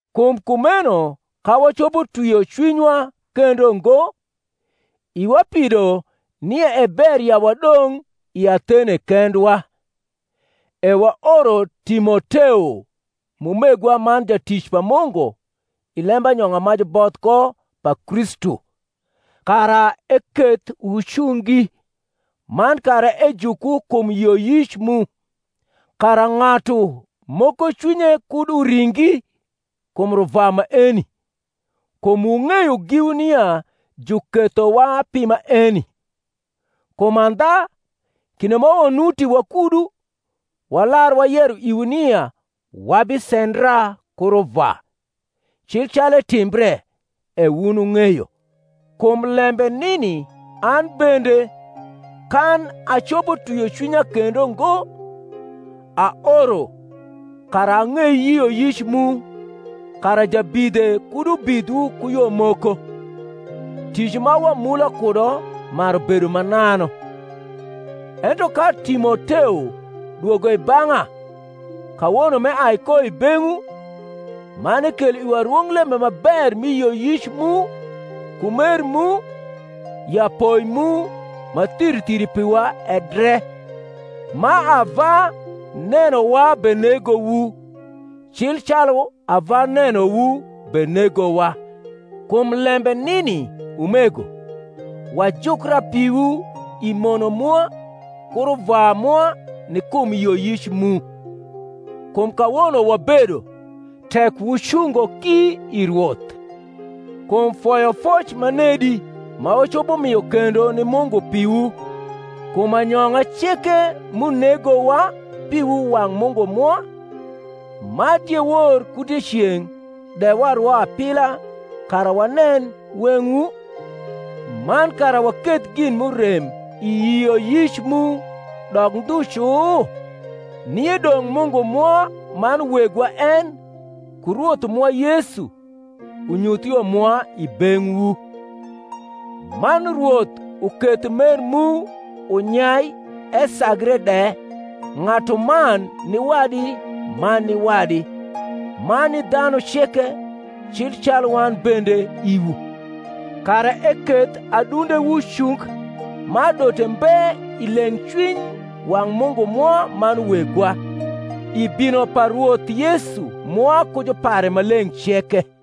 Kum kumeno ka wacopo twio cwinywa kendo ngo, iwa pido nia e ber ya wadong’ i Athene kendwa; e waoro Timoteo, m’umegwa man jatic pa Mungu i lembanyong’a ma juboth ko pa Kristu, kara eketh wucungi, man kara ejukwu kum yioyic mu; kara ng’atu moko cwinye kud uringi kum ruvwa maeni; kum wung’eyo giwu nia jukethowa pi maeni. Kum andha, kinde ma wanuti wakudu, walar wayero iwu nia wabisendra ku ruvwa; cil calu etimbre, e wun wung’eyo. Kum lembe nini an bende, kan acopo twio cwinya kendo ngo, aoro kara ang’ei yioyic mu, kara jabidhe kud ubidhwu ku yo moko, tic ma wamula kudo maru bedo mananu. Ento ka Timoteo dwogo i bang’a kawono m’eai ko i beng’wu, man ekelo iwa rwonglembe ma ber mi yioyic mu ku mer mu, ya poi mu ma thiri thiri piwa e dre, ma ava nenowa benegowu, cil calu ava nenowu benegowa; kum lembe nini, umego, wajukra piwu i mono mwa ku ruvwa mwa ni kum yioyic mu: kum kawono wabedo, tek wucungo ki i Rwoth. Kum foyofoc ma nedi ma wacopo mio kendo ni Mungu piwu, kum anyong’a ceke m’unegowa piwu wang’ Mungu mwa, ma diewor ku dieceng’ de warwo apila kara wanen weng’wu, man kara waketh gin m’urem i yioyic mu dok ndhu cu? Nie dong’ Mungu mwa man Wegwa en, ku Rwoth mwa Yesu, unyuth yo mwa i beng’wu: man Rwoth uketh mer mu unyai esagre de ng’atuman ni wadi man ni wadi, man ni dhanu ceke, cil calu wan bende iwu; kara eketh adundewu cung ma adote mbe i leng’cwiny wang’ Mungu mwa man Wegwa, i bino pa Rwoth Yesu mwa ku jupare maleng’ ceke.